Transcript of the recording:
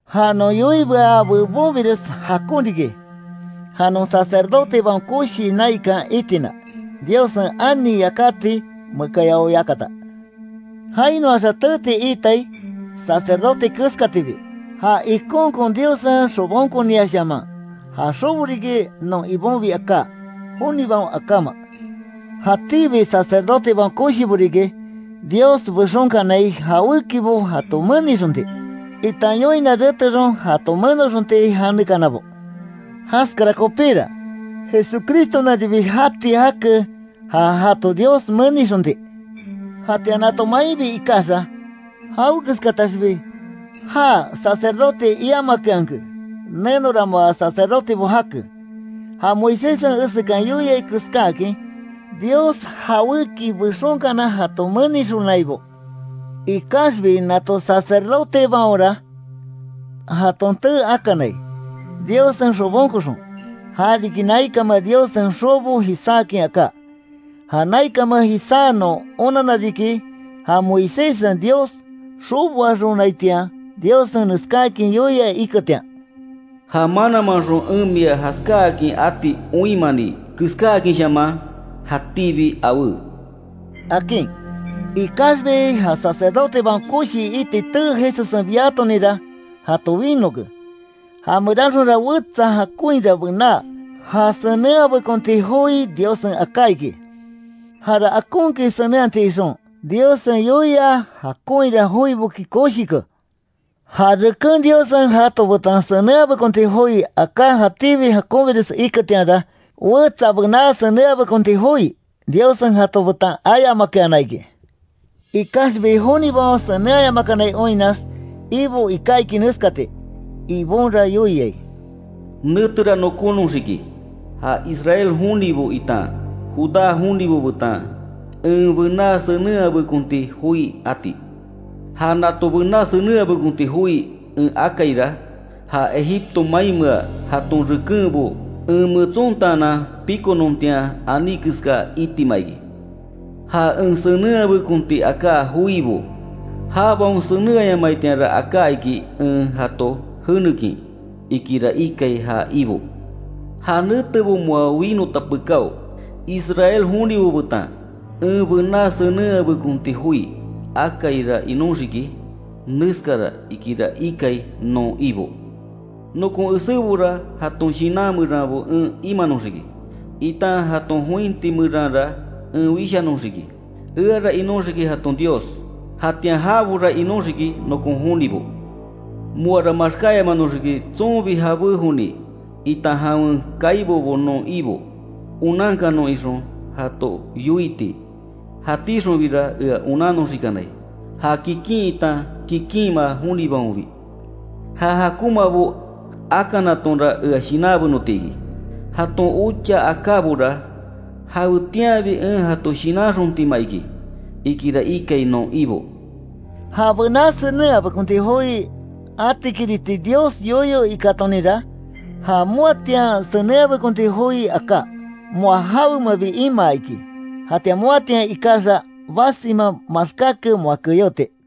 Ja non yoiibea bebonbires jakon riki, ja non Sacerdotebaon Koshi naikan itina, Diossen ani yakati mekayao yakata. Jainoaxa teeti itai, sacerdote keskatibi, ja ikonkon Diossen xobonkoniaxshaman, ja xobo riki non Ibonbi aká, jonibaon akáma. Jatíbi sacerdotebaon koshibo riki, Dios bexonkanai jawékibo jato menixonti, itan yoina retexon jato menoxonti janekanabo. Jaskara kopíra, Jesucristonaribi jati jake, ja jato Dios menixonti. Jatian nato mainbi ikaxa, jawekeskataxbi já sacerdote iamakeanke, nenora moa sacerdotebo jake, ja Moiséssen esekan yoiai keskáakin, Dios jawéki bexonkana jato menixonaibo. Ikaxbi nato sacerdotebaonra, jaton tee akanai, Diossen xobonkoxon, ja riki naikanmea Diossen xobo jisáakin aká. Ja naikanmea jisá non onanna riki, ja Moiséssen Dios xoboaxonaitian, Diossen neskáakin yoia iketian: “Ja mananmanxon en mia jaskáakin ati oinmani keskáakinshaman, jatíbi awé”, akin. Ikaxbi ja Sacerdotebaon Koshi iti tee Jesussen biatoninra, jato winoke, já meranxonra wetsa jakonhira bená ja senenhabekonti joi Diossen aká iki. Jara akonkin senenhati ixon, Diossen yoia jakonhira joiboki koshike. Ja reken Diossen jato betan senenhabekonti joi aká jatíbi jakonbires iketianra, wetsa bená senenhabekonti joi, Diossen jato betan ayamakeana iki. Ikaxbi jonibaon senenhayamakanai oinnax, Ibo iká iki neskati: “Ibonra yoiai: Netera nokónoxiki, ja Israel jonibo itan Judá jonibo betan, en bená senenhabekonti joi ati. Ja nato bená senenhabekonti joi en akaira, ja Egipto mainmea jaton rekenbo en metsontaanan pikonontian aní keska itima iki. Ja en senenhabekonti aká joibo, jabaon senenhayamaitianra aká iki, en jato jenekin, ikira ikai ja Ibo. Ja netebo moa winota pekáo, Israel jonibo betan, en bená senenhabekonti joi akaira inóxiki, neskara ikira ikai non Ibo: Nokon esébora jaton shinan meranbo en imanoxiki, itan jaton jointi meranra en wishanoxiki. Eara inóxiki jaton Dios, jatian jabora inóxiki nokon jonibo. Moara maxkáyamanoxiki tsonbi jabé joni, itan jawen kaibobo non Ibo onankanon ixon jato yoiti, jatíxonbira ea onannoxikanai, ja kikin itan kikinma jonibaonbi. Ja jakonmabo akanatonra, ea shinanbenoti iki, jaton ocha akábora jawetianbi en jato shinanxontima iki”, ikira ikai non Ibo. Ja bená senenhabekonti joi atikiriti Dios yoyo ikátoninra, ja moatian senenhabekonti joi aká, moa jawemabi imaa iki, jatian moatian ikaxa, basima maxkáke moa keyoti.